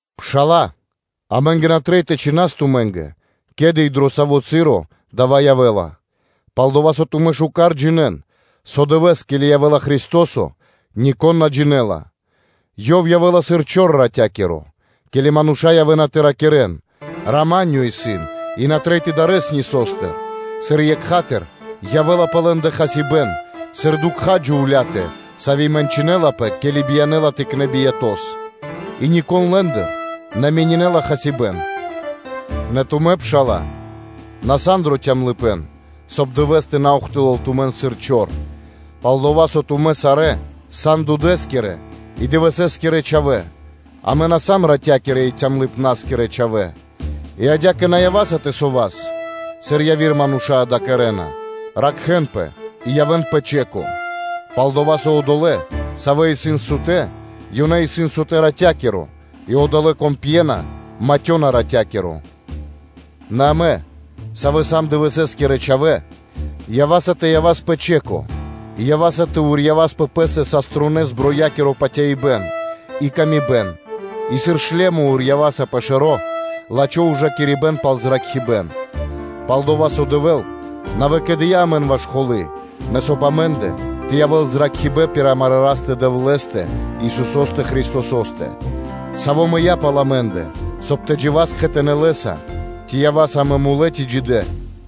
Пшала́лэ, амэ́нгэ на трэй тэ чхинас тумэ́нгэ, ке́ли и дро саво́ часо дава́ явэ́ла, пал-дова́ со тумэ́ лачхэ́с джинэ́на, со дывэ́с, ке́ли явэ́ла Христо́со, нико́н на джинэ́ла, Ёв явэ́ла сыр чор ратя́киро. Ке́ли мануша́ явэ́на тэ ракирэ́н: “Рама́нё исын и на трэй тэ дарэс ни со́стыр”, сыр екха́тыр (сра́зу) явэ́ла пэ лэ́ндэ хасибэ́н, сыр дукха́ джувля́тэ, сави́ мэнчынэлапэ, ке́ли биянэ́ла тыкнэ́ биято́с, и нико́н лэ́ндыр на менинэла хасибэ́н. Нэ тумэ́, пшала́лэ, на сан дро калыпэ́н (цямлыпэ́н), соб (кай) Дывэ́с тэ на ухтылэл тумэн сыр чор: пал-дова́ со тумэ́ сарэ́ сан дудэскирэ и дывэсэскирэ чхавэ́, амэ на сам ратякирэ и цямлыпнаскирэ чхавэ́. И адя́кэ, ява́са тэ ракхаспэ, сыр яви́р мануша́ дава́ кэрэ́на, ракхэ́нпэ и явэ́н пэ стрэ́га, пал-дова́ со одолэ́, савэ́ исын сутэ́, ёнэ исын сутэ́ ратя́киро, и одолэ́, кон пьела, матёна ратя́киро; Нэ амэ, савэ́ сам дывэсэскирэ чхавэ́, ява́са тэ явас пэ стрэ́га, и ява́са тэ урьявас пэ пэ́стэ бронь патяибнастыр и патыватыр и, сыр шлёмо урьяваса пэ шэро́ лачхо́ ужакирибэ́н пал зракхибэ́н; пал-дова́ со Дэвэ́л на выкэдыя́ амэн ваш холы́, нэ соб (кай) амэ́ндэ тэ явэ́л зракхибэ́н пир амарэ́ Растэ-Дэвлэ́стэ, Исусо́стэ Христосо́стэ, Саво́ мыя́ пал амэ́ндэ, соб (кай) тэ джива́с кхэтанэ́ Лэ́са, ци ява́са амэ тэ ракхаспэ, ци ява́са сутэ́.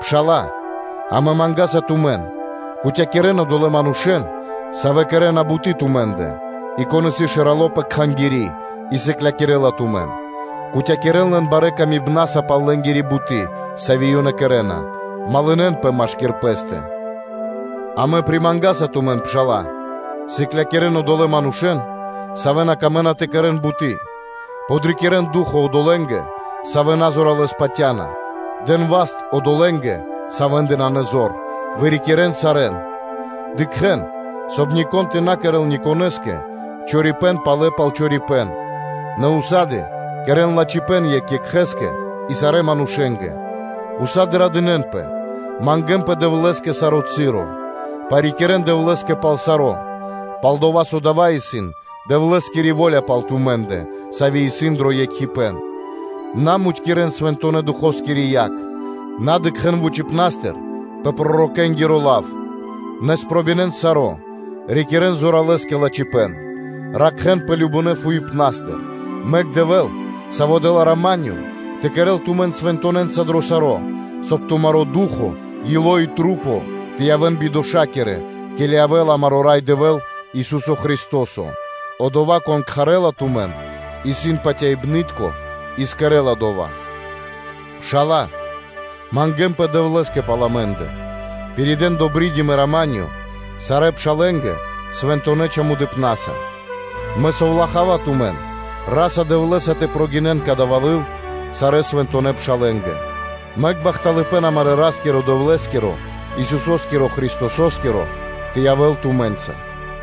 Пшала́лэ, амэ мангаса тумэн, кутякирэн (патывакирэн) одолэ́ манушэ́н, савэ́ кэрэ́на буты́ тумэ́ндэ, и кон исын шэрало́ пэ кхангири́, и сыклякирэ́ла тумэн, кутякирэн лэн барэ́ ковлыпнаса пал лэнгира буты́, сави́ ёнэ кэрэ́на. Малынэ́нпэ (дружынэн) машки́р пэ́стэ. Амэ примангаса тумэн, пшала́лэ, сыклякирэ́н одолэ́ манушэ́н, савэ́ на камэ́на тэ кэрэ́н буты́, подрикирэн ду́хо (фа́но) одолэ́нгэ, савэ́ на зоралэ́с патя́на, дэн васт одолэ́нгэ, савэ́ндэ нанэ зор, вырикирэн сарэ́н. Дыкхэ́н, соб (кай) нико́н тэ на кэрэ́л никонэ́скэ чорипэ́н палэ пал чорипэ́н, нэ ўса́ды (сак) кэрэ́н лачхипэ́н екх екхэ́скэ и сарэ́ манушэ́нгэ, тумэ́ усады (сак) радынэ́нпэ; Мангэ́нпэ Дэвлэ́скэ саро́ часо; парикирэ́н Дэвлэ́скэ пал саро́, пал-дова́ со дава́ исын Дэвлэ́скири во́ля пал тумэ́ндэ, сави́ исын дро екхипэ́н; на мудькирэн Свэнтонэ́-Духоскири яг, на дыкхэ́н вучипна́стыр пэ пророкэнгиро лав; нэ спробинэн саро́, рикирэ́н зоралэ́с кэ лачхипэ́н. Ракхэ́нпэ кажнонэ́ фуипнастыр. Мэк Дэвэ́л, Саво́ дэ́ла рама́нё, тэ кэрэ́л тумэн свэнтонэнца дро саро́, соб (кай) тумаро́ ду́хо (фа́но), ило́ и маса́ тэ явэ́н бидошакирэ, ке́ли явэ́ла амаро́ Рай Дэвэ́л, Ису́со Христо́со. Одова́, Кон кхарэ́ла тумэн, исын патяибны́тко и кэрэ́ла дова́. Пшала́лэ, мангэ́нпэ Дэвлэ́скэ пал амэ́ндэ. Пиридэ́н “добридим” и “рама́нё” сарэ́ пшалэ́нгэ свэнтонэ́ чамудыпнаса. Мэ совлахава тумэн Ра́са-Дэвлэ́са тэ прогинэн кадава́ лыл сарэ́ свэнтонэ́ пшалэ́нгэ. Мэк бахталыпэ́н амарэ́ Ра́скирэ-Дэвлэ́скиро, Исусо́скирэ Христосо́скиро тэ явэ́л тумэ́нца.